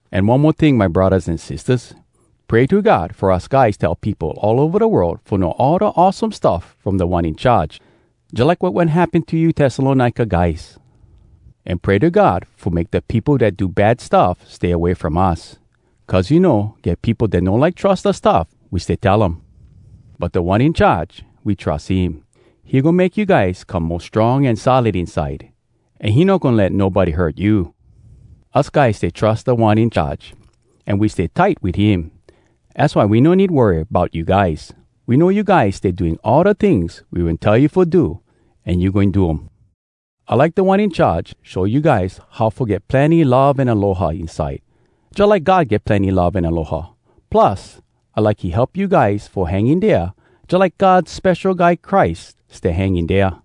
An one mo ting, my braddahs an sistahs. Pray to God fo us guys tell peopo all ova da world fo know all da awesome stuff from Da One In Charge, jalike wat wen happen to you Tessalonika guys. An pray to God fo make da peopo dat do bad stuff stay away from us. Cuz you know, get peopo dat no like trus da stuff we stay tell um. But Da One In Charge, we trus him. He goin make you guys come mo strong an solid inside, an he no goin let nobody hurt you. Us guys stay trus Da One In Charge, an we stay tight wit him. Az why we no need worry bout you guys. We know you guys stay doing all da tings we wen tell you fo do, an you goin do um. I like Da One In Charge show you guys how fo get plenny love an aloha inside, jalike God get plenny love an aloha. Plus, I like he help you guys fo hang in dea jalike God Spesho Guy Christ stay hang in dea.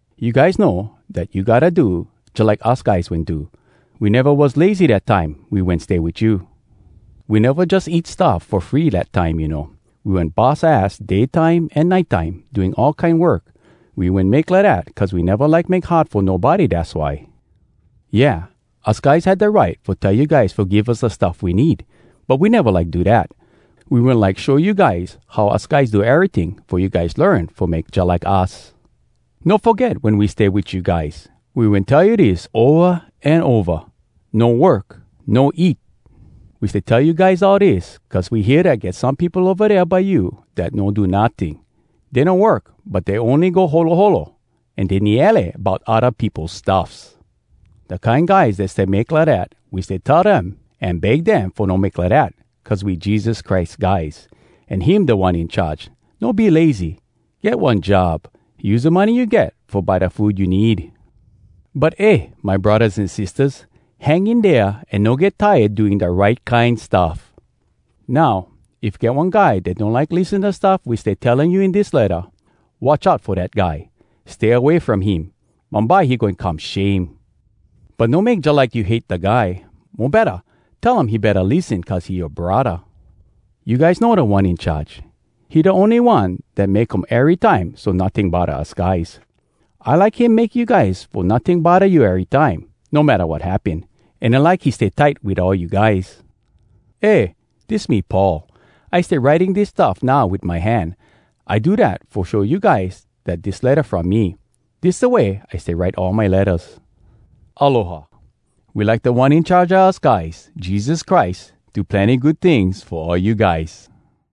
You guys know dat you gotta do jalike us guys wen do. We neva was lazy dat time we wen stay wit you. We neva jus eat stuff fo free dat time, you know. We wen bus ass day time an nite time, doing all kine work. We wen make lidat cuz we neva like make hard fo nobody, dass why. Yeah, us guys had da right fo tell you guys fo give us da stuff we need, but we neva like do dat. We wen like show you guys how us guys do eryting fo you guys learn fo make jalike us. No foget wen we stay wit you guys, we wen tell you dis ova an ova: “No work, no eat!” We stay tell you guys all dis, cuz we hear dat get some peopo ova dea by you dat no do notting. Dey no work, but dey ony go holoholo an dey niele bout odda peopo stuffs. Da kine guys dat stay make lidat, we stay tell dem an beg dem fo no make lidat, cuz we Jesus Christ guys, an him Da One In Charge. “No be lazy, get one job! Use da money you get fo buy da food you need!” But eh, my braddahs an sistahs! Hang in dea an no get tired doing da right kine stuff! Now, if get one guy dat no like lissen da stuff we stay telling you in dis letta, watch out fo dat guy. Stay away from him. Bumbye he goin come shame. But no make jalike you hate da guy. Mo betta, tell um he betta lissen cuz he yoa braddah. You guys know Da One In Charge, he da ony One dat make um erytime so notting bodda us guys. I like him make you guys fo notting bodda you erytime, no matta wat happen. An I like he stay tight wit all you guys. Eh! Dis me Paul. I stay writing dis stuff now wit my hand. I do dat fo show you guys dat dis letta from me. Dis da way I stay write all my lettas. Aloha. We like Da One In Charge a us guys, Jesus Christ, do plenny good tings fo all you guys.